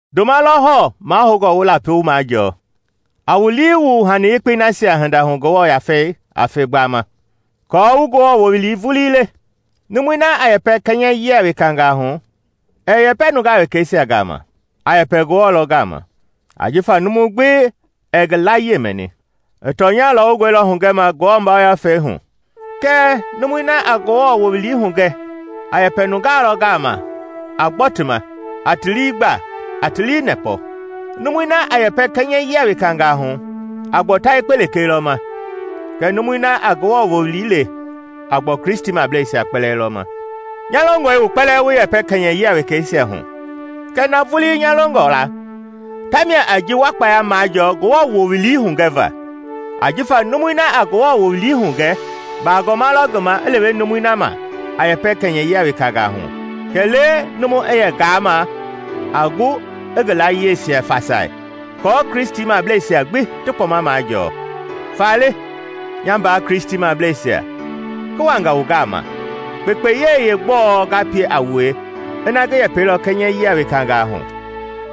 Ndoma lɔ hɔɔ mahoungɔ wu lapi wu majɔɔ. A wu lii wu hani yekpei nasia hinda hu Ngewɔ Yafei a fe gbama, aako wu Ngewɔ wowili vulii le. Numui na a yɛpɛ kɛnyɛyia wekangaa hu, ɛɛ yɛpɛ nungaa wekeisia gama, a yɛpɛ Ngewɔ lɔ gama, ajifa numu gbi ɛɛ ngi layie mɛni. I tɔnya lɔwungɔi lɔ hugɛma Ngewɔ Yafei hu. Kɛɛ numui na a Ngewɔ wowili hugɛ a yɛpɛ nungaa lɔ gama a gbɔ ti ma, a ti lii gba, a ti nɛpɔ. Numui na a yɛpɛ kɛnyɛyia wekangaa hu a gbɔ ta yekpe lekee lɔ ma, kɛɛ numui na a Ngewɔ wowili le a gbɔ Kristimableisia kpɛlɛɛ lɔ ma. Nya longɔe wu kpɛlɛɛ wu yɛpɛ kɛnyɛyia wekeisia hu kɛɛ na vulii nya longɔ la tamia a ji wa kpaya majɔɔ Ngewɔ wowili hugɛva. Ajifa numui na a Ngewɔ wowili hugɛ, bagɔma lɔ ngi ma i lewe numui na ma a yɛpɛ kɛnyɛyia wekangaa hu kɛlee numu i yɛ ngaama a gu i ngi layieisia fasai aako Kristimableisia gbi ti kpɔma majɔɔ. Faale, nya mbaa Kristimableisia, ngi wangaa wu gama, kpekpeyei yeegbɔɔ nga pie a wue ina ngi yɛpɛilɔ kɛnyɛyia wekangaa hu?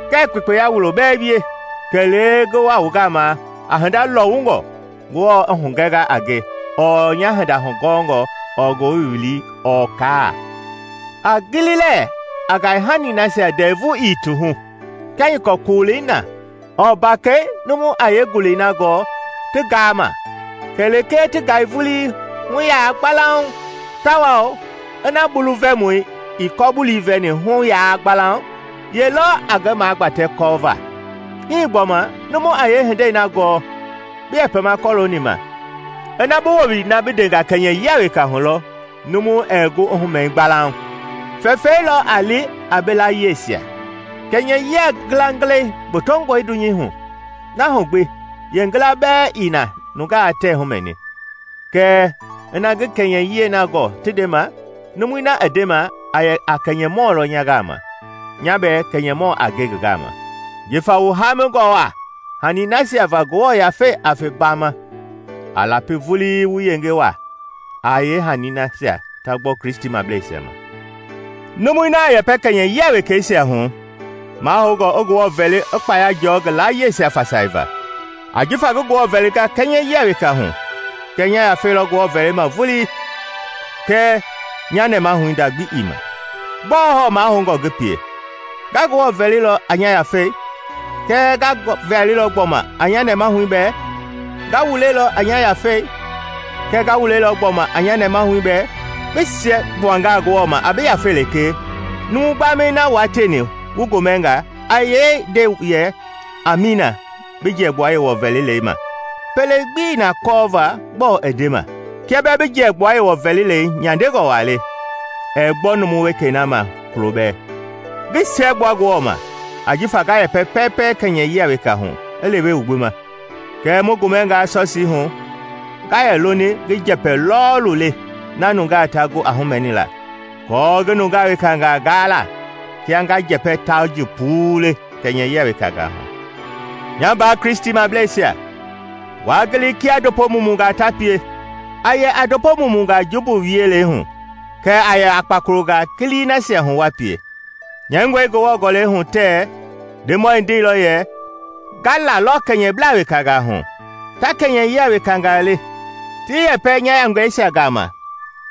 Ngɛɛ kpekpeya wulo bɛɛ wie, kɛlee ngi wa wu gama a hinda lɔwungɔ Ngewɔ i hugɛnga a nge ɔɔ nya hinda hugɔngɔ ɔɔ Ngewɔ wowili ɔɔ kaa. A gili lɛɛ a ngaihani nasia ndɛvu ii ti hu, kia nyɔkɔ koolei na ɔɔ mbakɛi numu a yee ngulei na gɔɔ ti ngaama kɛlee ti ngai vulii, hu yaa loke? Tawao ina bulu vɛmɔi ii kɔ-bulii vɛni hu yaa loke, ye lɔ a ngi magbatɛ kɔ va? Hii gbɔma, numu a yee hindei na gɔɔ bi yɛpɛma kɔlooni ma ina bi wowili na bi ndenga kɛnyɛyia weka hu lɔ numu ɛɛ gu i humɛi gbalauŋ? Fɛfɛi lɔ a li a bi layieisia! Kɛnyɛyia ngilangilɛi gbotongɔe dunyei hu, na hu gbi yeengila bɛɛ ii na nungaa tɛɛ humɛni. Kɛɛ ina ngii kɛnyɛyiɛi na gɔɔ ti ndema, numui na i ndema a yɛ a kɛnyɛmɔ lɔ nya gama, nya bɛɛ kɛnyɛmɔ a nge ngi gama. Jifa wu haamingɔ waa hani nasia va Ngewɔ Yafei a fe gbama, a lapi vulii wu yenge waa a yeenasia ta gbɔ Kristimableisia ma. Numui na a yɛpɛ kɛnyɛyia wekeisia hu, mahoungɔ i Ngewɔ vɛli i kpaya jɔɔ ngi layieisia fasaiva. Ajifa ngi Ngewɔ vɛlingaa kɛnyɛyia weka hu kɛ nya yafei lɔ Ngewɔ vɛlima vulii kɛɛ nya nɛmahui nda gbi ii ma. Gbɔɔ hɔɔ mahoungɔ ngi pie? Nga Ngewɔ vɛlilɔ a nya yafei, kɛɛ nga ngi vɛlilɔ gbɔma a nya nɛmahui bɛɛ; nga wulelɔ a nya yafei kɛɛ nga wulelɔ gbɔma a nya nɛɛmahui bɛɛ. Bi siɛgbuangaa Ngewɔ ma a bi yafei lekee, numu gbamɛi na wua tieni wu gomɛnga a yee nde yɛ Amiina bi jiɛgbua Yewɔ vɛlilei ma? Pele gbii na kɔɔva gbɔɔ bi ndema. Kia bɛɛ bi jiɛgbua Yewɔ vɛlilei nyandengɔ waa le, ɛɛ gbɔ numu wekei na ma kulo bɛɛ. Ngi siɛgbua Ngewɔ ma ajifa nga yɛpɛ pɛɛpɛ kɛnyɛyia weka hu i lewe wu gbi ma. Kɛɛ mu gomɛngaa Sɔsiihu, nga yɛ loni ngi njɛpɛ lɔɔlu le na nungaa ta gu a humɛnila aako ngi nungaa wekangaa gaa la kia ngaa njɛpɛ tauji puu le kɛnyɛyia wekangaa hu. Nya mbaa Kristimableisia, waa gili kia ndopo mumungaa ta pie. A yɛ a ndopo mumungaa jumbu wielei hu kɛɛ a yɛ a kpakolongaa kilii nasia hu wa pie. Nyɛingɔe Ngewɔ Gɔlɛi hu tɛɛ Ndemɔi ndeilɔ yɛ, “Nga lalɔ kɛnyɛblaa wekangaa hu ta kɛnyɛyia wekangaa le, ngi yɛpɛ nya nungeisia gama,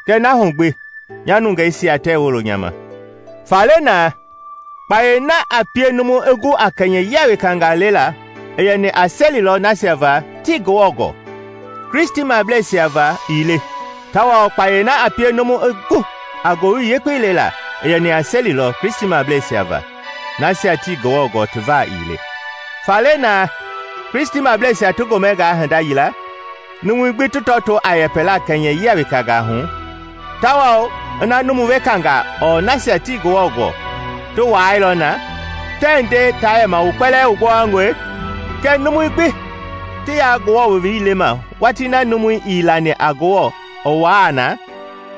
kɛɛ na hu gbi nya nungeisia tɛɛ wolo nya ma,” Faale na, kpayei na a pie numu i gu a kɛnyɛyia wekangaa lela i yɛni a seli lɔ nasia va tii Ngewɔ gɔɔ, Kristimableisia va ii le, tawao kpayei na a pie numu i gu a ngowili yekpei lela i yɛni a seli lɔ Kristimableisia va, nasia tii Ngewɔ gɔɔ ti va ii le. Faale na Kristimableisia ti gomɛngaa hinda yila numui gbi ti tɔtoo a yɛpɛla kɛnyɛyia wekangaa hu, tawao ina numu wekangaa ɔɔ nasia tii Ngewɔ gɔɔ ti wuaailɔ na, tɛɛ nde taa yɛma wu kpɛlɛɛ wu gbowangɔe? Kɛɛ numui gbi ti yaa Ngewɔ wowili lema watii numui na ii lani a Ngewɔ i wuaa na,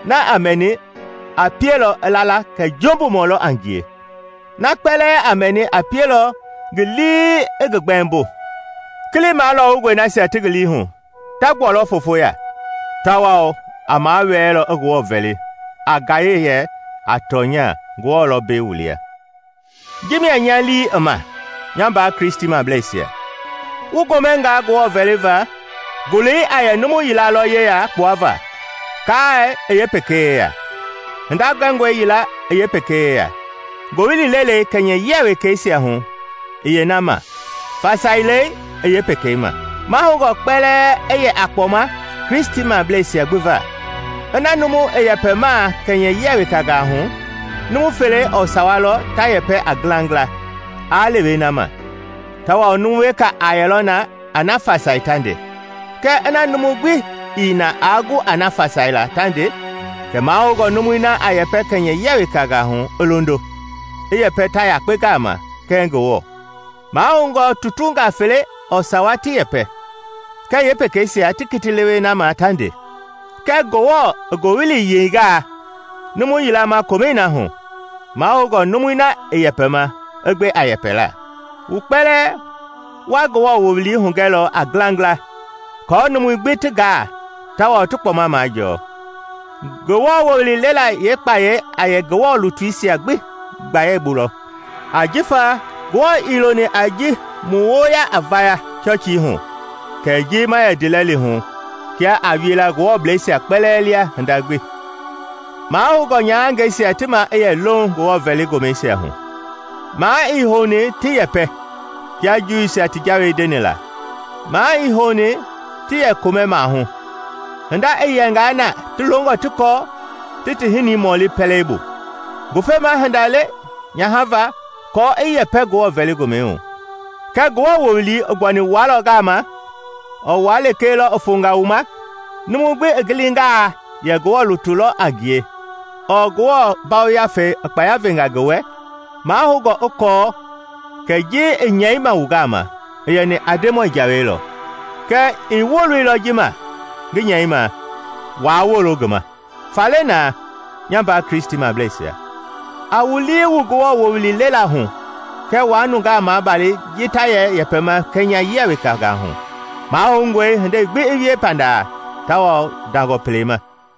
na a mɛni a pielɔ i la la kɛ jumbumɔ lɔ a ngie. Na kpɛlɛɛ a mɛni a pielɔ ngi lii i ngi gbɛmbo. Kili malɔwungɔi nasia ti ngi liihu ta gbualɔ foofo ya, tawao a mawɛɛlɔ i Ngewɔ vɛli, a gaye yɛ, “A tɔnya, Ngewɔ lɔ mbei wu lia!” Ji mia nya lii i ma, nya mbaa Kristimableisia. Wu gomɛngaa Ngewɔ vɛliva, ngulei a yɛ numu yila lɔ yeya kpuava, kaai i pekei yeya, hinda gɛngɔi yila i yeepekei yeya, ngowili lelei kɛnyɛyia wekeisia hu i yeena ma, fasailei i yeepekei ma. Mahoungɔ kpɛlɛɛ i yɛ a kpɔma Kristimableisia gbi va. Ina numu i yɛpɛmaa kɛnyɛyia wekangaa hu, numu fele ɔɔ sawa lɔ ta yɛpɛ a ngilangila, aa lewe na ma, tawao numu weka a yɛlɔ na a na fasai ta nde. Kɛɛ ina numu gbi ii na aa gu a na fasaila ta nde kɛ mahoungɔ numui na a yɛpɛ kɛnyɛyia wekangaa hu i londo, i yɛpɛ ta yekpe gama kɛɛ Ngewɔ. Mahoungɔ tutungaa fele ɔɔ sawa ti yɛpɛ, kɛ yeepekeisia ti kiti lewe na ma ta nde. Kɛɛ Ngewɔ i ngowili yeingaa numu yila ma komɛi na hu, mahoungɔ numui na i yɛpɛma, i gbe a yɛpɛla. Wu kpɛlɛɛ wa Ngewɔ wowili hugɛlɔ a ngilangila aako numui gbi ti gaa tawao ti kpɔma majɔɔ. Ngewɔ wowili lela yeekpayɛi a yɛ Ngewɔ lutuisia ti gbayei bu lɔ, ajifa Ngewɔ ii loni a ji mu woo a vaya hu Sɔsiihu kɛ ji ma yɛ ndiilɛli hu. Kia a wie la Ngewɔbleisia kpɛlɛɛ lia hinda gbi, mahoungɔ nyahangɛisia ti maa i yɛ louŋ Ngewɔ vɛli gomɛisia hu. Maa i houni ti yɛpɛ, kia Juuisia ti jawei ndeni la, maa ii houni ti yɛ komɛ maahu. Hinda i yɛngaa na ti longɔ ti kɔɔ, ti ti hinii mɔli pɛleibu. Ngufema hinda le nyaha va kɔ i yɛpɛ Ngewɔ vɛli gomɛ hu. Kɛ Ngewɔ wowili i gbuani wua lɔ gama? Ɔɔ wua lekee lɔ i fonga wu ma? Numu gbi i gilingaa yɛ Ngewɔ lutu lɔ a ngie ɔɔ Ngewɔ Yafei i kpaya venga ngi wɛ, mahoungɔ i kɔɔ kɛ ji ngi nyɛima wu gama i yɛni a Ndemɔi jawei lɔ. Kɛɛ ii woloilɔ ji ma ngi nyɛima, waa wolo ngi ma. Faale na, nya mbaa Kristimableisia, a wu lii wu Ngewɔ wowili lela hu kɛɛ waa nungaa maabali ji ta yɛ yɛpɛma kɛnyɛyia wekangaa hu. Mahoungɔe hindei gbi i wie panda tawao ndangɔ pele ma.